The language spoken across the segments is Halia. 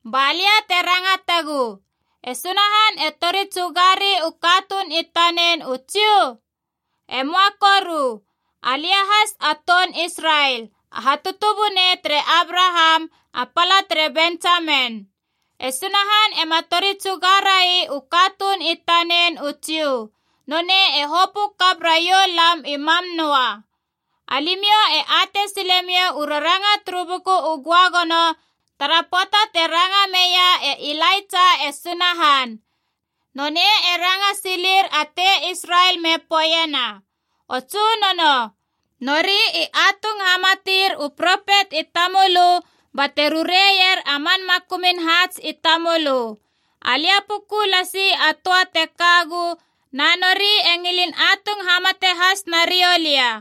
Ba lia te rangatagu, e Sunahan e tori tsugari u katuun i tanen u Jiu? E möa koru. Alia has a toun Israel, a hatutubunei tere Abraham, a pala tere Bentsamen. E Sunahan ema tori tsuga rai u katuun i tanen u Jiu. Nonei e hopö kap raiou lam i mam noa. Alimiou e atei silemiou u raranga turu Buku u Göagono tara pöata te ranga meia e Ilaitsa e Sunahan. Nonei e ranga silir a tei Israel me poeiena, “O Tsunono, nori i atung hamatir u propet i tamölö bate rureier a man makumun haats i tamölö. Alia puku lasi a töa te kagu, na nori e ngilin atung hamate has nariou lia.”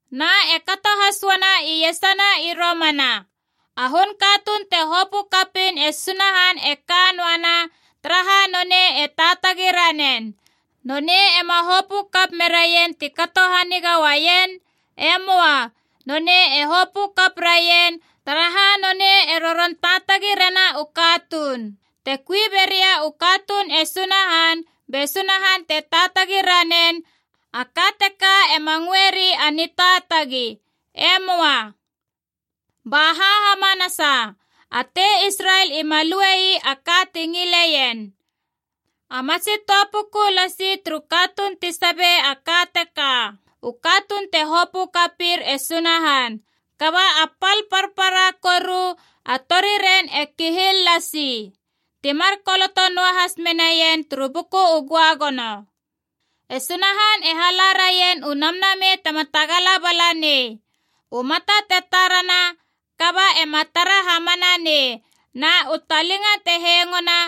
Na e kato has uana iesana i romana. A hun katuun te hopö kapiin e Sunahan e ka noana, taraha nonei e taatagi ranen. Nonei ema hopö kap meraien ti kato haniga uaien. E möa. Nonei e hopö kap raien, taraha nonei e roron taatagi rena u katuun. Te kui beria u katuun e Sunahan be Sunahan te taatagi ranen, a ka teka ema ngöeri a nitaatagi. E möa. Baha hamanasa? A tei Israel ima lue ii a ka ti ngileien. A matsi töa puku lasi turu katuun ti sabe a ka teka, u katuun te hopö kapir e Sunahan. Kaba a pal parpara koru a tori ren e kihil lasi. Ti mar koloto noahas menaien turu Buku u Göagono: “E Sunahan e hala raien u namnamei tema tagala bala nei, u mata te tarana kaba ema tara hamana nei na u talinga te hengona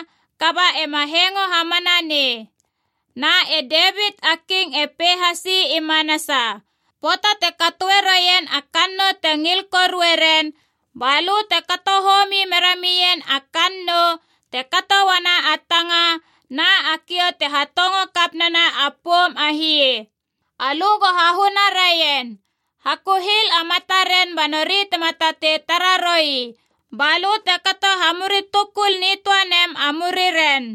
kaba ema hengo hamana nei.” Na e Devit a King e pei hasi i manasa: “Pöata te katoe roien a kannou te ngil korue ren, ba lö te kato homi mera mien a kannou, te kato uana a tanga na a kiou te hatongo kap nena a poum a hie. Alö go hahuna raien. Hakuhil a mataren ba nori tema tatei tara roi, balö te kato hamuri tukul nitöa nem a muriren.”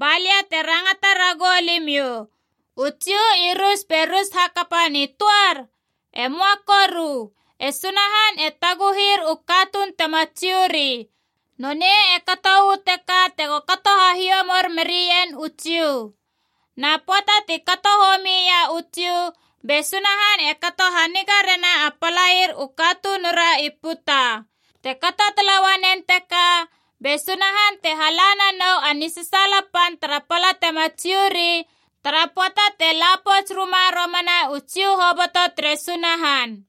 Ba lia te rangata ragou limiou, u Jiu i rus be rus hakapa nitöar? E möa koru! E Sunahan e taguhir u katuun tema Jiu ri. Nonei e kato uu teka tego kato hahiomor merien u Jiu. Na pöata ti kato homi ia u Jiu, be Sunahan e kato haniga rena a palair u katunura i puta. Te kato tala uanen teka, be Sunahan te hala nanou a nisasaala pan tara pala tema Jiu ri tara pöata te la pouts ruma romana u Jiu hoboto tere Sunahan.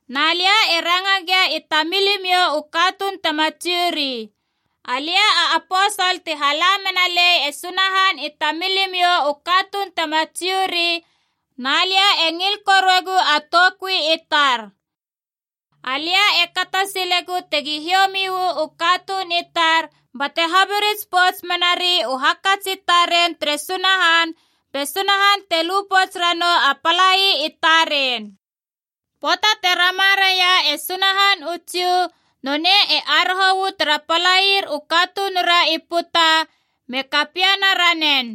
Na lia e ranga gia i tamilimiou u katuun tema Jiu ri. Alia a aposol te hala mena lei e Sunahan i tamilimiou u katuun tema Jiu ri, na lia e ngil koruegu a toukui i tar. Alia e kato silegu tegi hiomi uu katuun i tar, bate habirits pouts menari u hakats i taren tere Sunahan be Sunahan te lu pouts ranou a palai i taren. Pöata te rama raia e Sunahan u Jiu, nonei e aroho uu tara palair u katunura i puta me kapiena ranen.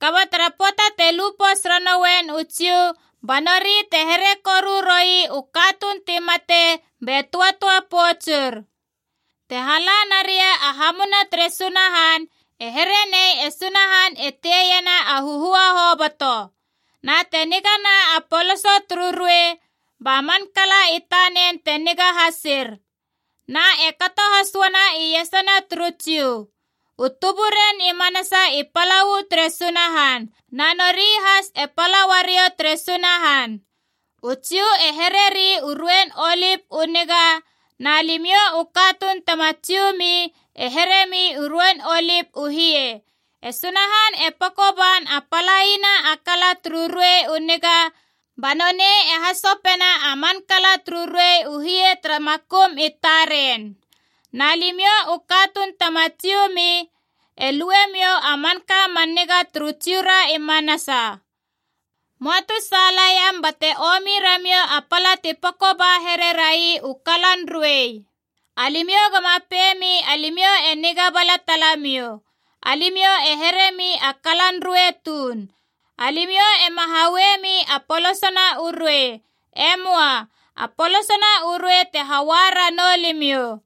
Kaba tara pöata te lu pouts ranouen u Jiu, ba nori te here koru roi u katuun ti mate be töatöa poutsur. Te hala naria a hamuna tere Sunahan, e here nei e Sunahan e teiena a huhua hoboto. Na te nigana a poloso turu ruei, ba man kala i tanen te niga hasir. Na e kato has uana iesana turu Jiu. U tuburen i manasa i pala uu tere Sunahan, na nori has e pala uariou tere Sunahan. U Jiu e hereri u ruein olip u niga, na limiou u katuun tema Jiu mi e heremi u ruein olip u hie. E Sunahan e peko ban a palaina a kala turu ruei u niga, ba nonei e hasopena a man kala turu ruei u hie tara makum i taren. Na limiou u katuun tema Jiu mi e luemiou a manka man niga turu Jiura i manasa. Möa tu saalaiam bate omi ramiou a pala ti peko ba here rai u kalan ruei. Alimiou goma pei mi alimiou e niga bala talamiou. Alimiou e heremi a kalan ruei tuun. Alimiou ema hauemi a polosona u ruei. E möa. A polosona u ruei te haua ranou limiou.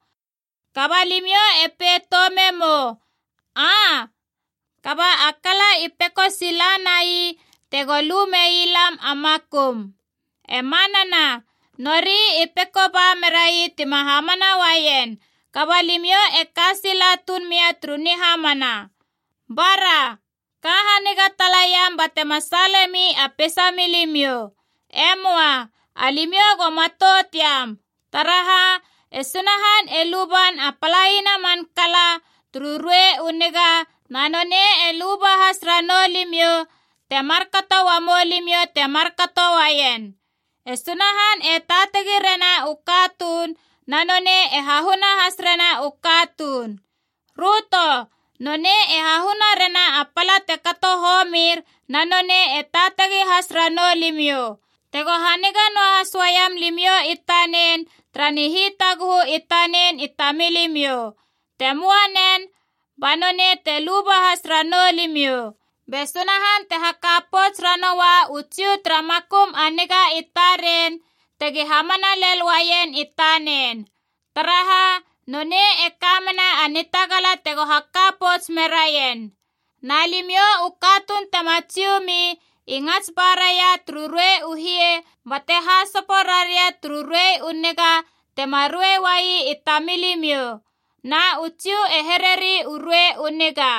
Kaba limiou e pei toume mou, “Aa, kaba a kala i peko sila nai tego lu mei lam a makum.” E manana. Nori i peko ba merai tima hamana uaien. Kaba limiou e ka sila tuun mia turu nihamana. Bara! Ka haniga talaiam batema saalemi a peisamilimiou. E möa. Alimiou go matout iam. Taraha, e Sunahan e luban a palaina a man kala turu ruei u niga, na nonei e luba has ranou limiou te markato uamou limiou ti markato uaien. E Sunahan e taatagi rena u katuun, na nonei e hahuna has rena u katuun. Röto: nonei e hahuna rena a pala te kato homir, na nonei e taatagi has ranou limiou, tego haniga noahas uaiam limiou i tanen tara nihitaguhu i tanen i tamilimiou. Te möa nen, ba nonei te luba has ranou limiou. Be Sunahan te haka pouts ranoua u Jiu tara makum a niga i taren tegi hamana lel uaien i tanen. Taraha, nonei e ka mena a nitagala tego haka pouts meraien. Na limiou u katuun tema Jiu mi i ngats ba raia turu ruei u hie bate hasopo raria turu ruei u niga tema ruei uai i tamilimiou. Na u Jiu e hereri u ruei u niga.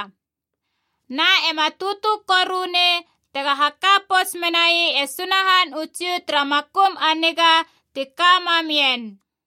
Na ema tutu koru nei tega haka pouts menai e Sunahan u Jiu tara makum a niga tika mam ien.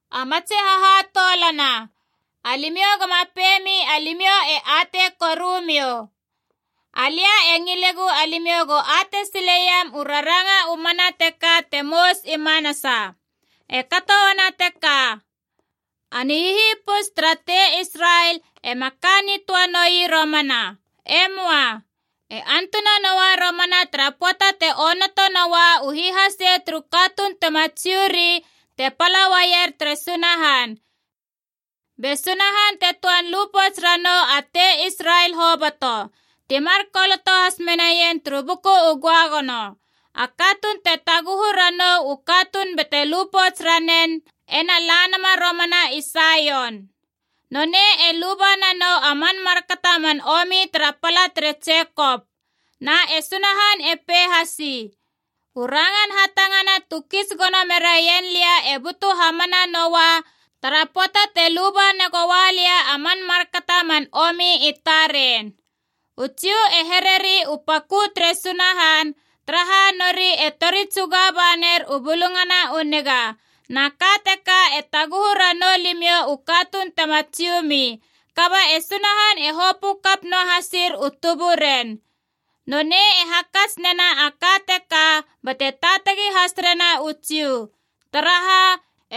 A matsi hahatoulana, alimiou goma pei mi alimiou e atei korumiou. Alia e ngilegu alimiou go atei sileiam u raranga u mana teka te mous i manasa: e kato uana teka, a nihihipus tara tei Israel ema ka nitöa noi romana. E möa. E antuna noa romana tara pöata te onoto noua u hihase turu katuun tema Jiu ri te pala uaier tere Sunahan. Be Sunahan te töan lu pouts ranou a tei Israel hoboto. Ti mar koloto has menaien turu Buku u Göagono: “A katuun te taguhu ranou u katuun bate lu pouts ranen ena la nama romana i Saion. Nonei e luba nanou a man markato a man omi tara pala tere Jekop.” Na e Sunahan e pei hasi, “U rangan hatangana tu kits gono meraien lia e butu hamana noua tara pöata te luba negoa lia a man markato a man omi i taren.” U Jiu e hereri u pakö tere Sunahan, taraha nori e tori tsuga ba ner u Bulungana u Niga. Na ka teka e taguhu ranou limiou u katuun tema Jiu mi. Kaba e Sunahan e hopö kap noa hasir u tuburen. Nonei e hakats nena a ka teka bate taatagi has rena u Jiu. Taraha,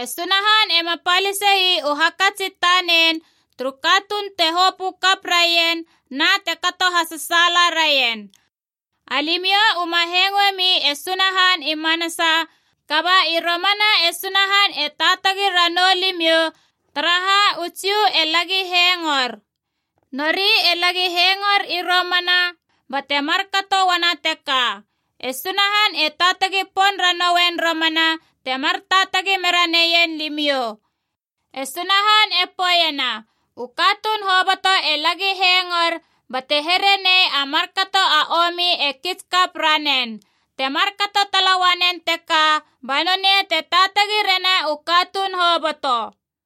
e Sunahan ema palise ii u hakats i tanen turu katuun te hopö kap raien na te kato hasasaala raien. Alimiou uma hengoe mi e Sunahan i manasa, kaba i romana e Sunahan e taatagi ranou limiou, taraha u Jiu e lagi hengor. Nori e lagi hengor i romana, bate markato uana teka, e Sunahan e taatagi pon ranouen romana temar taatagi mera neien limiou. E Sunahan e poeiena u katuun hoboto e lagi hengor bate here nei a markato a omi e kits kap ranen. Te markato tala uanen teka ba nonei te taatagi rena u katuun hoboto.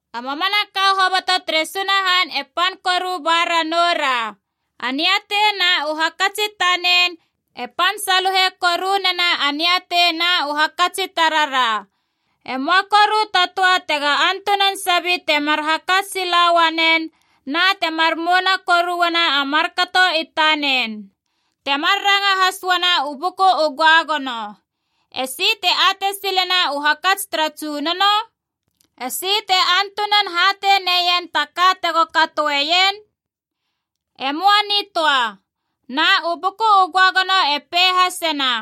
A mamanaka hoboto tere Sunahan e pan koru ba ranou ra. A niatei na u hakats i tanen e pan saluhe koru nena a niatei na u hakats i tarara. E möa koru ta töa tega antunan sabi temar hakats sila uanen na temar mouna koru uana a markato i tanen. Te mar ranga has uana u Buku u Göagono: “Esi te atei silena u hakats tara Tsunono? Esi te antunan hatei neien ta ka tego katoeien? E möa nitöa.” Na u Buku u Göagono e pei hasena: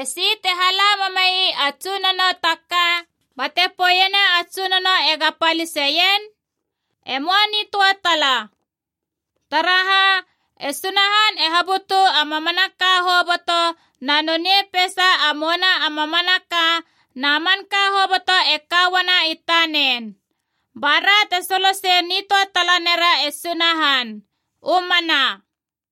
“Esi te hala mamei a Tsunono ta ka bate poeiena a Tsunono ega paliseien? E möa nitöa tala.” Taraha, e Sunahan e habutu a mamanaka hoboto na nonei peisa a mouna a mamanaka, na manka hoboto e ka uana i tanen. Ba ra te solosei nitöa tala nera e Sunahan. U mana.